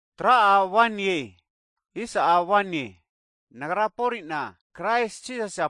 Hagi nagra Poli'na, Krais Jisasi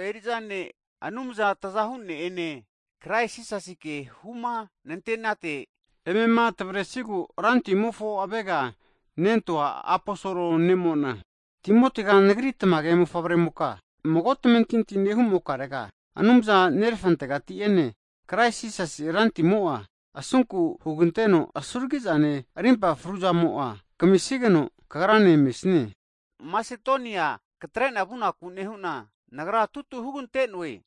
eri'za ne'mo'na Anumza Tazahu ne'ene Krais Jisasike humanantenate, emema tavaresigu Rantimofo avega nentoa aposolo ne'mo'na, Timotiga nagri tamage mofavremoka mago tamentinti nehu'mokarega, Anumza Nerafantegati'ene Krais Jisasi Ranti'mo'a asunku huganteno asurgi'zane, arimpa fruzana kamisigeno kagrane mesie. Hagi Masedonia katre'na vunaku nehu'na, nagra tutu hugante'noe.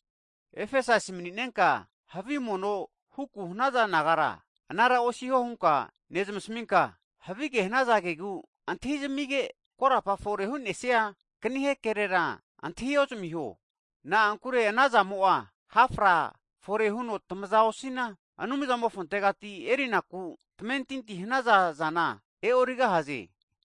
Efesasi mani'nenka havi mono huku hanaza nagara, anara osiho hunka nezmasminka, havige hanaza kegu antahi zamige, korapa fore hu'nesia kanihe kerera antahi ozamiho. Na'ankure ana zamo'a hafra fore huno tamaza osina, Anumza'mofontegati erinaku tamentinti hanaza zana e'origahaze.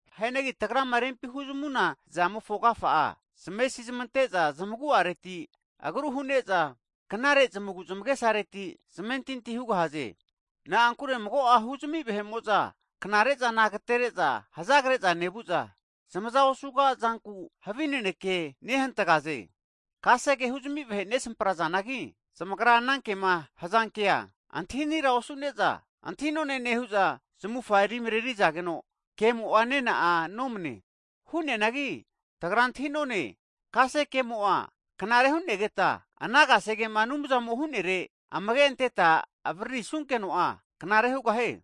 Hianagi tagrama rempi hunezamuna zamofo agafa'a, zamesi nezmante'za zamagu'areti agru hu'ne'za, knare zamagu'zamagesareti zamentinti hugahaze. Na'ankure mago'a rempi huzmi vahe'mo'za knare'zana agatere'za hazagre'za nevu'za, zamaza osugazanku havi naneke nehantagaze. Kasege huzamasmi vahe nesampra'zanagi, zamagra ana kema hazankea antahinira osu'ne'za, antahi'none nehu'za zamufa eri mareri'zageno kemo'a nena'a nomane. Hu'neanagi tagra antahi'none, kasegemo'a knare hu'negeta, ana kasegema Anumzamo hu'nere, amage anteta avariri sunkeno'a knare hugahie.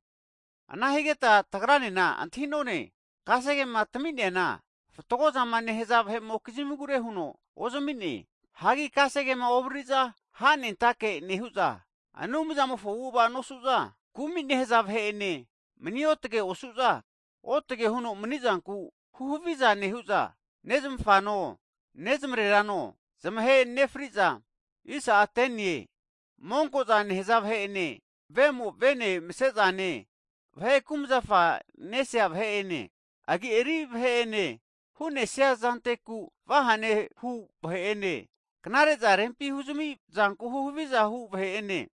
Hagi tagranena antahi'none kasegema tami'neana fatgozama nehaza vahe'mokizmigure huno ozami'ne. Hagi kasegema ovariri'za ha'nentake nehu'za, Anumzamofo avu'ava nosu'za kumi' nehaza vahe'ene mani otage osu'za, otage huno mani'zanku huhavi'za nehu'za, nezmafano nezamrerano zamahe nefri'za, vahe zamahe nefri'za, monko'za nehaza vahe'ene, vemo vene mase'zane, vahe kumzafa nesea vahe'ene, agi'ari vahe'ene, hu'nesia zanteku vahane hu' vahe'ene, knare'za rempi huzmi zanku huhaviza hu vahe zami'ne.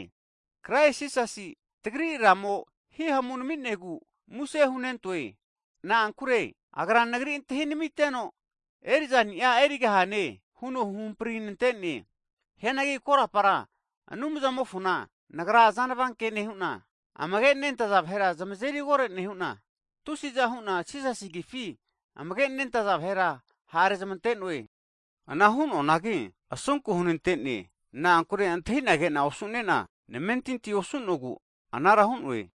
Hagi Krais Jisasi'a tagri Ramo, hihamu nami'negu muse hunentoe. Na'ankure Agra nagri antahinamiteno, erizani'a erigahane huno huhamprinante'ne. Hianagi korapara Anumzamofona nagra azanva ke nehu'na, amage' nentaza vahera zamazeri kore nehu'na, tusiza hu'na Jisasi agifi amage'nentaza vahera harezmante'noe. Ana hu'noanagi asunku hunante'ne. Na'ankure antahi'na ke'na osu'nena namentintia osu'nogu anara hu'noe.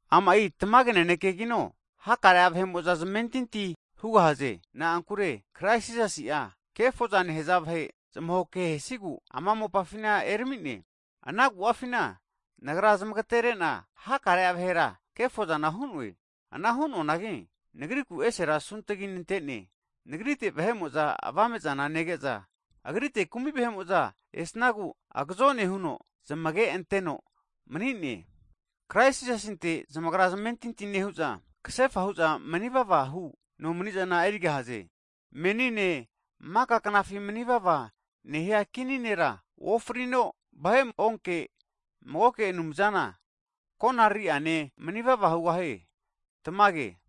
Ama'i tamage nanekegino, hakare'a vahe'mo'za zamentinti hugahaze. Na'ankure Krais Jisasi'a kefoza nehaza vahe zamahokehesigu ama mopafina erami'ne. Ana agu'afina nagra zamagtere'na hakare vahera kefo'zana hu'noe. Ana hu'noanagi, nagriku esera asuntagi nante'ne, nagrite vahe'mo'za avame zana nege'za, Agrite kumi' vahe'mo'za esnagu agazone huno zamega anteno mani'ne, Krais Jisasinte zamagra zamentinti nehu'za, kasefa hu'za mani vavahu nomani'zana erigahaze. Menine maka knafima manivava nehia Kini nera, ofrino, vahe'mo onke, magoke Anumzana, konariri'ane manivava hugahie. Tamage.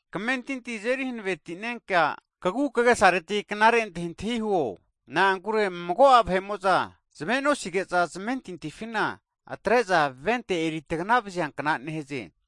Kamentintia azeri hanavetinenka, kagu kagesareti knare antahintahi huo. Na'ankure mago'a vahe'mo'za ana nanekegura zamenosige'za zamentintifina atre'za ventemo tagana vaziankna nehaze.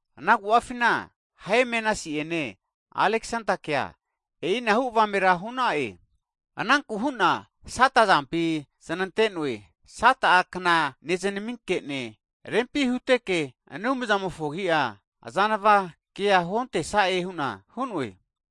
Ana agu'afina Haimenasi ene Aleksandake, e'inahu avamera hu'na'e. Ananku hu'na Sata azampi zanante'noe, Sata'a kna nezanaminke'ne rempi huteke, Anumzamofo agi'amofona azanva kea huontesa'e hu'na hu'noe.